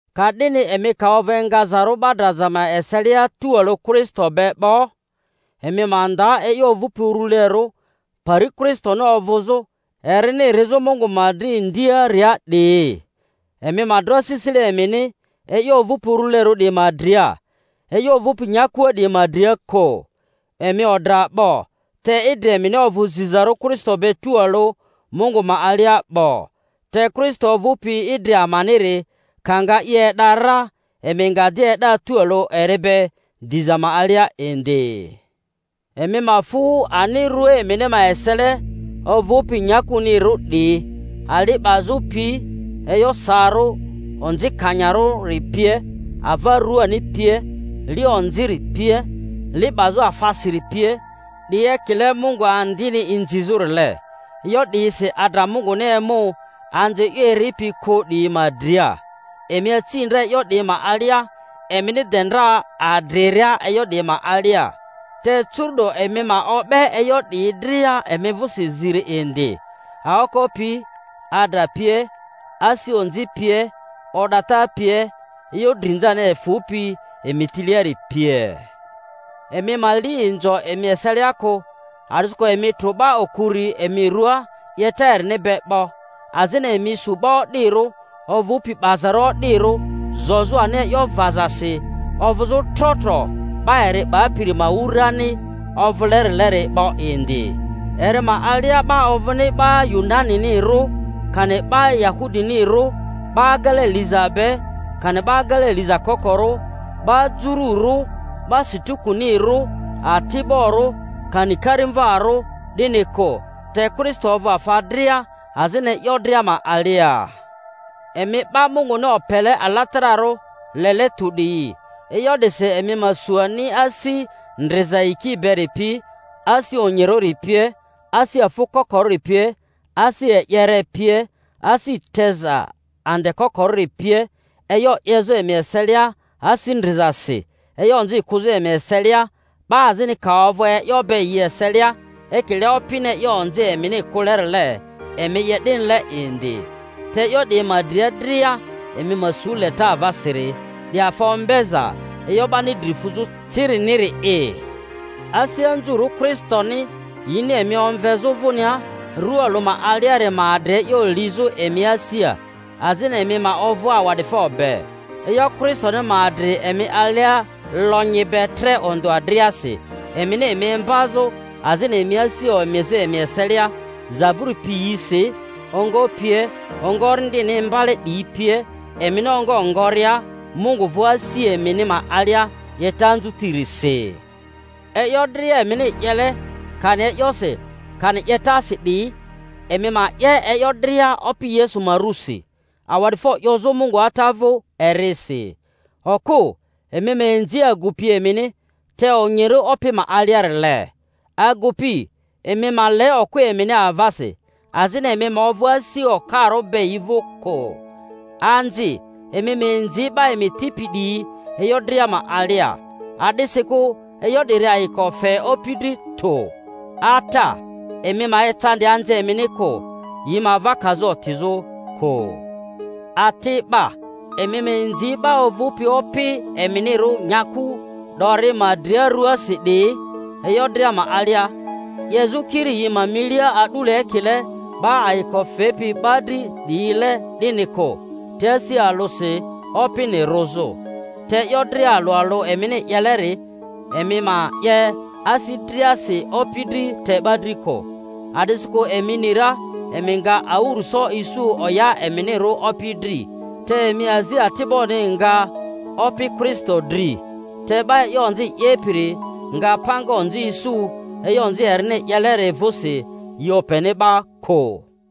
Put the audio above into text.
Ka'dini emi ka ovᴜ engazarᴜ 'ba draza ma eselia tualᴜ Kristo be 'bo, emi ma nda e'yo ovᴜpi urulerᴜ, pari Kristoni ovᴜzᴜ erini rizᴜ Mungu ma dri ndiaria 'diyi. Emi ma dro asisile emini e'yo ovᴜpi urulerᴜ 'diyi ma dria, e'yo ovᴜpi nyakua 'diyi ma dria kᴜ. Emi odra 'bo, te idri emini ovᴜ zizarᴜ Kristo be tualᴜ Mungu ma alia 'bo. Te Kristo ovᴜpi idri amaniri ka nga i e'da ra, emi nga di e'da tualᴜ eri be diza ma alia indi. Emi ma fᴜ ani rua emini ma esele ovᴜpi nyakunirᴜ 'diyi: ali 'bazᴜ pi, e'yo saarᴜ onzikanyarᴜri pie, ava ruani pie, li onziri pie, li 'bazᴜ afasiri pie, 'di ekile mungu andini inzizᴜrile. E'yo 'diyisi adra Munguni emu anzi e'yo eripi kᴜ 'diyi ma dria. Emi aci ndra e'yo 'diyi ma alia, emini de ndra adriria e'yo 'diyi ma alia. Te curu'do emi ma o'be e'yo 'diyi dria emI vᴜsi ziri indi. aoko pi, adra pie, asi onzI pie, o'data pie, e'yo drinzani efᴜpi emi tiliari pie. Emi ma li inzo emi eselia kᴜ, a'disikᴜ emi trᴜ 'ba okuri emi ruaa 'yeta erini be 'bo, azini emi su 'ba o'dirᴜ, ovᴜpi 'bazarᴜ o'dirᴜ zozᴜ ani e'yo vazasi ovᴜzᴜ tro tro 'ba eri 'bapiri ma wurani ovᴜlerileri 'bo indi. Eri ma alia 'ba ovᴜni 'ba Yunaninirᴜ, kani 'ba Yahudinirᴜ, 'ba agele liza be, kani 'ba agele liza kokorᴜ, 'ba jururᴜ, 'ba Sikutinirᴜ, ati'borᴜ, kani karimvarᴜ, 'dini kᴜ, te Kristo ovᴜ afa dria, azini e'yo dria ma alia. Emi 'ba Munguni opele alatararᴜ, lele tᴜ 'diyi, e'yo 'disi emi ma su ani asi ndriza yiki beri pi, asi onyirᴜri pie, asi afᴜ kokorᴜri pie, asi e'yere pie, asi teza ande kokorᴜri pie, e'yo 'yezᴜ emi eselia asi ndrizasi, e'yo onzi kᴜzᴜ emi eselia, 'ba azini ka ovᴜ e'yo be yi eselia; ekile Opini e'yo onzi emini kᴜlerile, emi 'ye 'dinile indi. Te e'yo 'diyi ma dria dria emi ma su leta avasiri, 'di afa ombeza e'yo 'bani dri fuzᴜ ciriniri’i. Asi anzurᴜ Kristoni yini emi omvezᴜ vᴜnia rua alᴜ ma aliari ma adri e'yo lizᴜ emi asia; azini emi ma ovᴜ awa'difo be. E'yo Kristoni ma adri emi alia lonyi be tre ondᴜa driasi, emini emi imbazᴜ azini emi asi omizᴜ emi eselia; zaburi piyisi, ongo pie, ongo Orindini inibale 'diyi pie, emini ongo ngoria Mungu vᴜ asi emini ma alia 'yeta anzutirisi. E'yo dria emini 'yele, kani e'yosi kani 'yetasi 'diyi, emi ma 'ye e'yo dria Opi Yesu ma rᴜsi, awa'difo 'yozᴜ Mungu Ata vᴜ erisi. Okᴜ, emi ma inzi agupi emini, te onyirᴜ Opi ma aliarile. Agu-pi, emi ma le okᴜ emini avasi, azini emi ma ovᴜ asi okarᴜ be yi vᴜ kᴜ. Anzi, emi ma inzi 'ba emi tipi 'diyi e'yo dria ma alia, a'disikᴜ e'yo 'diri ayiko fe Opi dri tᴜ. Ata, emi ma ecandi anzi emini kᴜ, yi ma ava kazᴜ otizᴜ kᴜ. Ati'ba, emi ma inzi 'ba ovᴜpi opi eminirᴜ nyaku 'dori ma dria ruasi 'diyi e'yo dria ma alia, 'yezᴜ kiri yi ma milia a'dule ekile 'ba ayiko fepi 'ba dri 'diyile 'dini kᴜ, te asi alᴜsi, Opini rᴜzᴜ. Te e'yo dria alᴜ alᴜ emini 'yeleri, emi ma 'ye asi driasi, Opi dri te 'ba dri kᴜ, a'disikᴜ emi ni ra emi nga awᴜrᴜso isu oya eminirᴜ Opi dri; te emi azi ati'boni nga Opi Kristo dri. Te 'ba e'yo onzi 'yepiri nga panga onzi isu e'yo onzi erini 'yeleri vᴜsi, yi openi 'ba kᴜ.